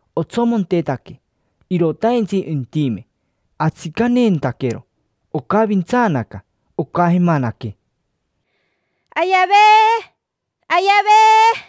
Otsomontetaque, irotaintsi intime, atsicaneentaquero, ocavintsaanaca, ocajemanaque: —Ayavee, ayavee.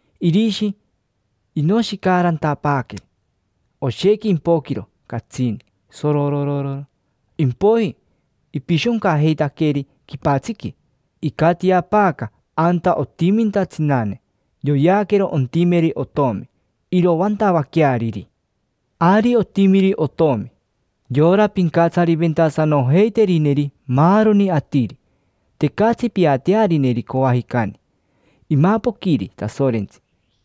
Irishi inoshicaarantapaaqueri oshequi impoquiro catsini, sorororo; impoiji ipishoncajeitaqueri quipatsiqui. Icatiapaaca anta otiminta tsinane, yoyeaquero ontimeri otomi, iroantavaqueariri. Ari otimiri otomi, yora pincatsariventasanojeiterineri maaroni atiri; tecatsi piatearineri coajicani. Imapoquiri Tasorentsi,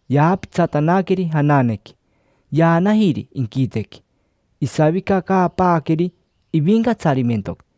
yaapitsatanaqueri jananequi, yaanajiri inquitequi, isavicacaapaaqueri ivincatsarimentoqui.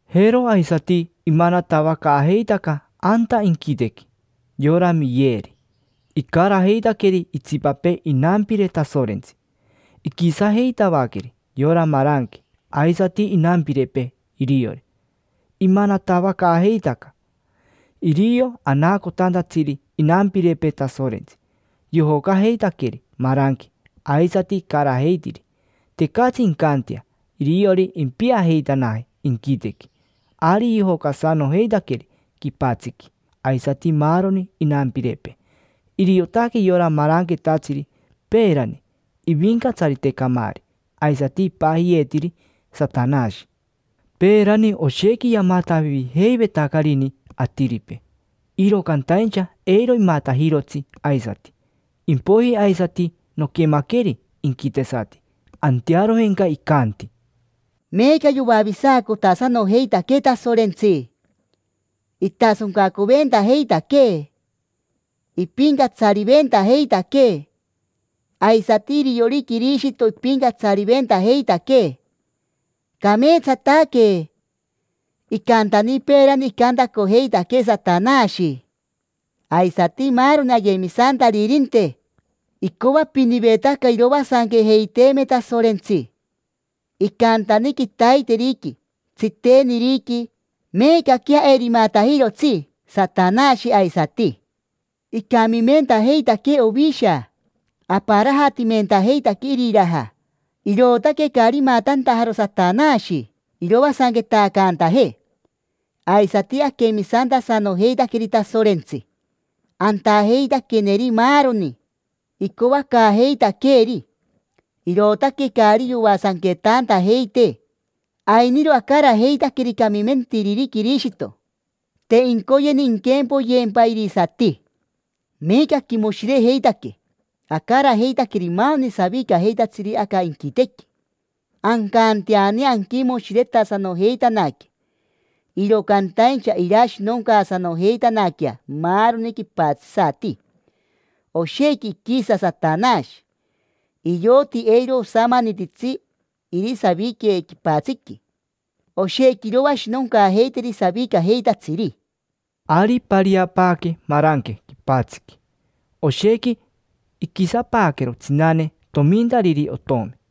Jero aisati imanatavacaajeitaca anta inquitequi. Yora Miyeri, icarajeitaqueri itsipapee inampire Tasorentsi, iquisajeitavaqueri yora maranque aisati inampirepee iriori; imanatavacaajeitaca. Irio anaacotantatsiri inampirepee Tasorentsi, yojocajeitaqueri maranque aisati icarajeitiri, tecatsi incantea iriori impiajeitanaje inquitequi. Ari yojocasanojeitaqueri quipatsiqui, aisati maaroni inampirepee. Iriotaque yora maranquetatsiri peerani: ivincatsarite camaari, aisati ipajiyeetiri Satanashi. Peerani oshequi yamatavijeivetacarini atiripee, iro cantaincha eiro imatajirotsi aisati. Impoiji aisati noquemaqueri inquitesati, antearojenca icanti: —Meeca yoavisacotasanojeitaquee Tasorentsi, itasoncacoventajeitaquee, ipincatsariventajeitaquee; aisati iriori Quirishito ipincatsariventajeitaquee. Cameetsataque. Icantani peerani icantacojeitaquee Satanashi, aisati maaroni ayemisantaririnte, icoapinivetaca iroasanquejeiteeme Tasorentsi: icantani, quitaiteriqui, tsiteniriqui. Meecaquea eiro imatajirotsi Satanashi aisati. Icamimentajeitaquee Ovisha, aparajatimentajeitaquee iriraja, irootaque caari imatantajaro Satanashi iroasanquetacantajee. Aisati aquemisantasanojeitaqueri Tasorentsi, antajeitaqueneri maaroni icoacaajeitaqueeri, irootaque caari yoasanquetantajeitee. Ainiro acarajeitaqueri camimentiriri Quirishito, te incoyeni inquempoyeempa irisati. Meeca aquimoshirejeitaque, acarajeitaqueri maaroni savicajeitatsiri aca inquitequi; ancanteani anquimoshiretasanojeitanaque. Iro cantaincha irashinoncaasanojeitanaquea maaroni quipatsisati. Oshequi iquisa Satanashi, ioti eiro osamanititsi irisavique quipatsiqui, oshequi iroashinoncaajeiteri savicajeitatsiri. Ari ipariapaaque maranque quipatsiqui, oshequi iquisapaaquero tsinane tomintariri otomi.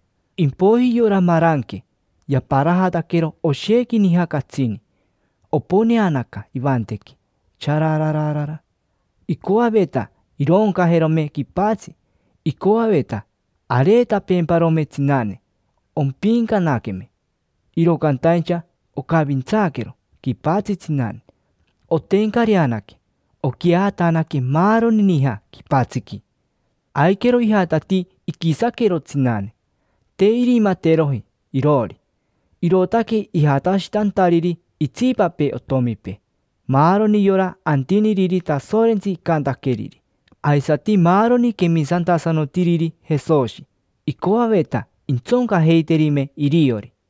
Impoiji yora maranque yaparajataquero oshequi nija catsini, oponeanaca ivantequi, chararara; icoaveta irooncajerome quipatsi, icoaveta areetapeemparome tsinane, ompiincanaqueme. Iro cantaincha ocavintsaaquero quipatsi tsinane, otencareanaque, oquiajatanaque maaroni nija quipatsiqui. Aiquero ijatatii iquisaquero tsinane. Te irimateroji iroori, irootaque ijatashitantariri itsipapee otomipee: maaroni yora antiniriri Tasorentsi icantaqueriri, aisati maaroni quemisantasanotiriri Jesoshi; icoaveta intsoncajeiterime iriori.